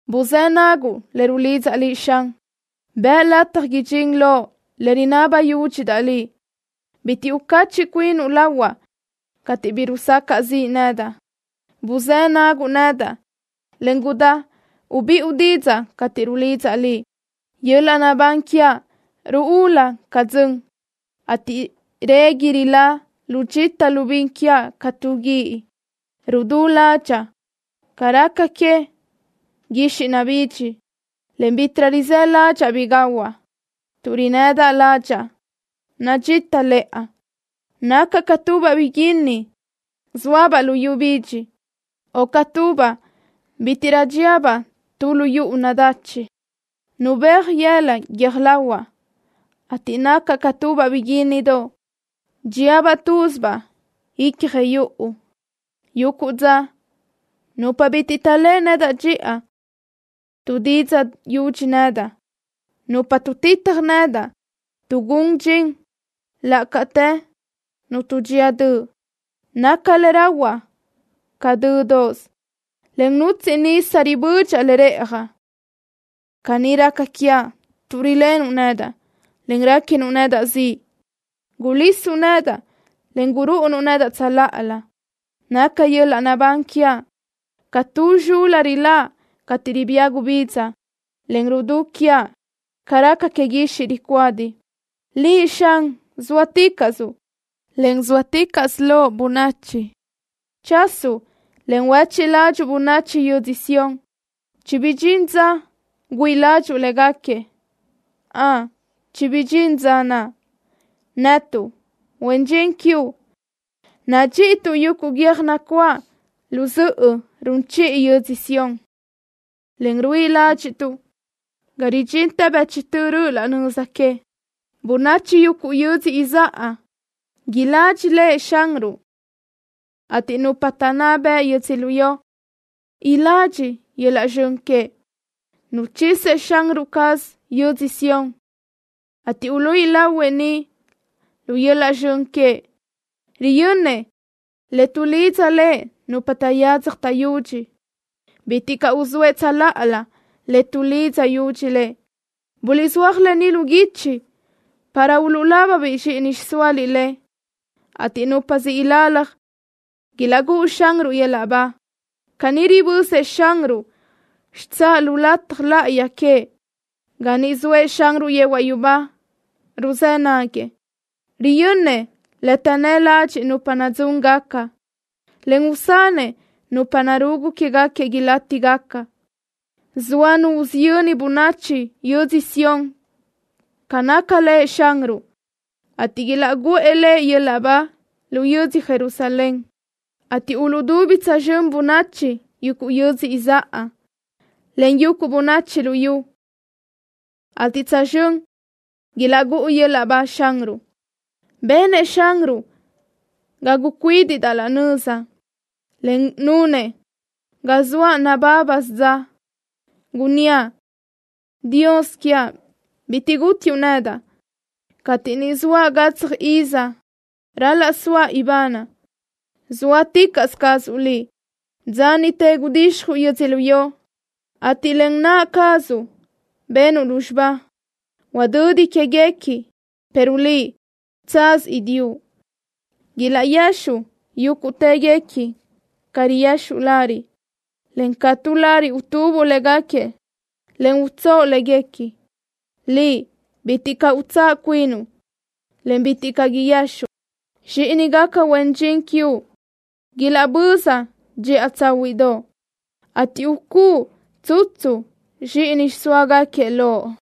¡Buzë́ naguʼ le rulidzaʼ Liʼ, Xan! ¡Bëʼ lataj idxín loʼ le rinaba yúdxidaʼ Liʼ! Bitiʼ ucacheʼ cuinuʼ lahuaʼ cateʼ bi rusacaʼ ziʼ nedaʼ. Buzë́ naguʼ nedaʼ, en gudáchi ubiʼu didzaʼ cateʼ rulidzaʼ Liʼ. Yöl-laʼ naʼbán quiaʼ ruúlu ca dzön, ateʼ régui rilá lu dxita lu bin quiaʼ ca tu guíʼ. Rudú ládxaʼa ca raca que guixiʼ nabidxi, en bítiʼrö rizë́ ládxaʼa bi gahuaʼ. Tuʼ rinnëdaʼ ládxaʼa nadxítalëʼa. Nacaʼ ca tubaʼ biguínni zóabaʼ luyú bidxi, o ca tubaʼ cuturú dxíabaʼ tu lu yuʼu nadachi. Nabéaj yëla guiö́j lahuaʼ, ateʼ nacaʼ ca tubaʼ biguínnidoʼ dxíabaʼ túzibaʼ ícjoʼo yuʼu. Yuguʼ dza nupa bitiʼ taʼléʼe nedaʼ dxiʼa tuʼdidzaʼ yudxi nedaʼ. Nupa tuʼtitaj nedaʼ tuʼgún dxin laʼ cateʼ nu tuʼdxía döʼ. Naca le rahuaʼ ca dö́doʼsö, en nutsiʼ nisa ribödxaʼ le rëʼjaʼ. Caní raca quiaʼ tuʼ rilenuʼ nedaʼ, en réquinuʼ nedaʼ ziʼ. Gulisuʼ nedaʼ, en gurúʼunuʼ nedaʼ tsöláʼalö. Naca yöl-laʼ naʼbán quiaʼ ca tu zxul-la riláʼ cateʼ ribía gubidza, en rudú quiaʼ ca raca que guixiʼ ricuádi. ¡Liʼ, Xan, zóaticaʼsuʼ, en zóalenticaʼsö Loʼ bönachi! ¡Chasuʼ, en huéchiʼ ládxuʼu bönachi yödzö Sión! ¡Chibidxín dza güíʼi ládxuʼu léguequi! ¡Ön, chibidxín dza naʼ! Netuʼ, huen dxin quiuʼ, nadxíʼituʼ yuguʼ guiö́j nacuáʼ lu zöʼö run chiʼi yödzö Sión, en ruíʼi ládxiʼtuʼ ga ridxintë bëchtö röʼö laʼ nöza que. Bönachi yuguʼ yödzö izáʼa iladxi Lëʼ Xanruʼ, ateʼ nupa taʼnná bëʼ yödzölió iladxi yöl-laʼ zxön queëʼ. ¡Nuchisëʼ Xanruʼ caz yödzö Sión, ateʼ uluíʼi lahuëʼ niʼ lu yöl-laʼ zxön queëʼ! Riyönnëʼ le tuʼlidza Lëʼ nupa taʼyadzaj taʼyudxi. Bitiʼ caʼ uzóëʼ tsöláʼalö le tuʼlidza yudxi Lëʼ. Buliʼzúaj lë ni lu guichi para uluʼlaba zxíʼini xiʼsóaliʼ le, ateʼ nupa siʼ ilalaj ilaʼgúʼu Xanruʼ yöl-laʼ ba. Ga niʼ ribözëʼ Xanruʼ xitsáʼ lu lataj láʼayi queëʼ, ga niʼ zoëʼ Xanruʼ yehuaʼ yubá, ruzë́ naguëʼ. Riyönnëʼ le taʼnnë́ ladxiʼ nupa nadzúngaca, en usanëʼ nupa narugu quéguequi ilátigaca. Soa nu usiyöni bönachi yödzö Sión ca naca Lëʼ Xanruʼ, ateʼ ilaʼgúʼu Lëʼ yöl-laʼ ba lu yödzö Jerusalén, cateʼ uluʼdubi tsözxö́n bönachi yuguʼ yödzö izáʼa, en bönachi yuguʼ luyú, ateʼ tsözxö́n ilaʼgúʼu yöl-laʼ ba Xanruʼ. Benëʼ Xanruʼ ga gucuídiʼdaʼ laʼ nöza, en nunëʼ ga soaʼ nabábasö dza. Gunníaʼ: Dios quiaʼ, bitiʼ gútiuʼ nedaʼ cateʼ ni zoaʼ gatsaj iza ral-laʼ soaʼ ibanaʼ. Zóaticaʼsö cazuʼ Liʼ. Dza niʼte gudixjuʼ yödzölió, ateʼ len naʼ cazuʼ benuʼ lúzxiba. Huadödi quéguequi, pero Liʼ, tsaz idiʼu. Ilexuʼ yúguʼtëguequi ca riyexuʼ lariʼ, en ca tu lariʼ utubuʼ léguequi, en utsóʼo léguequi. Liʼ, bitiʼ caʼ utsáʼ cuinuʼ, en bitiʼ caʼ guexuʼ. Zxíʼinigaca huen dxin quiuʼ ilaʼböza dxiʼa tsáhuiʼdoʼ, ateʼ ucúʼu tsutsu zxíʼini xiʼsóagaquiëʼ loʼ.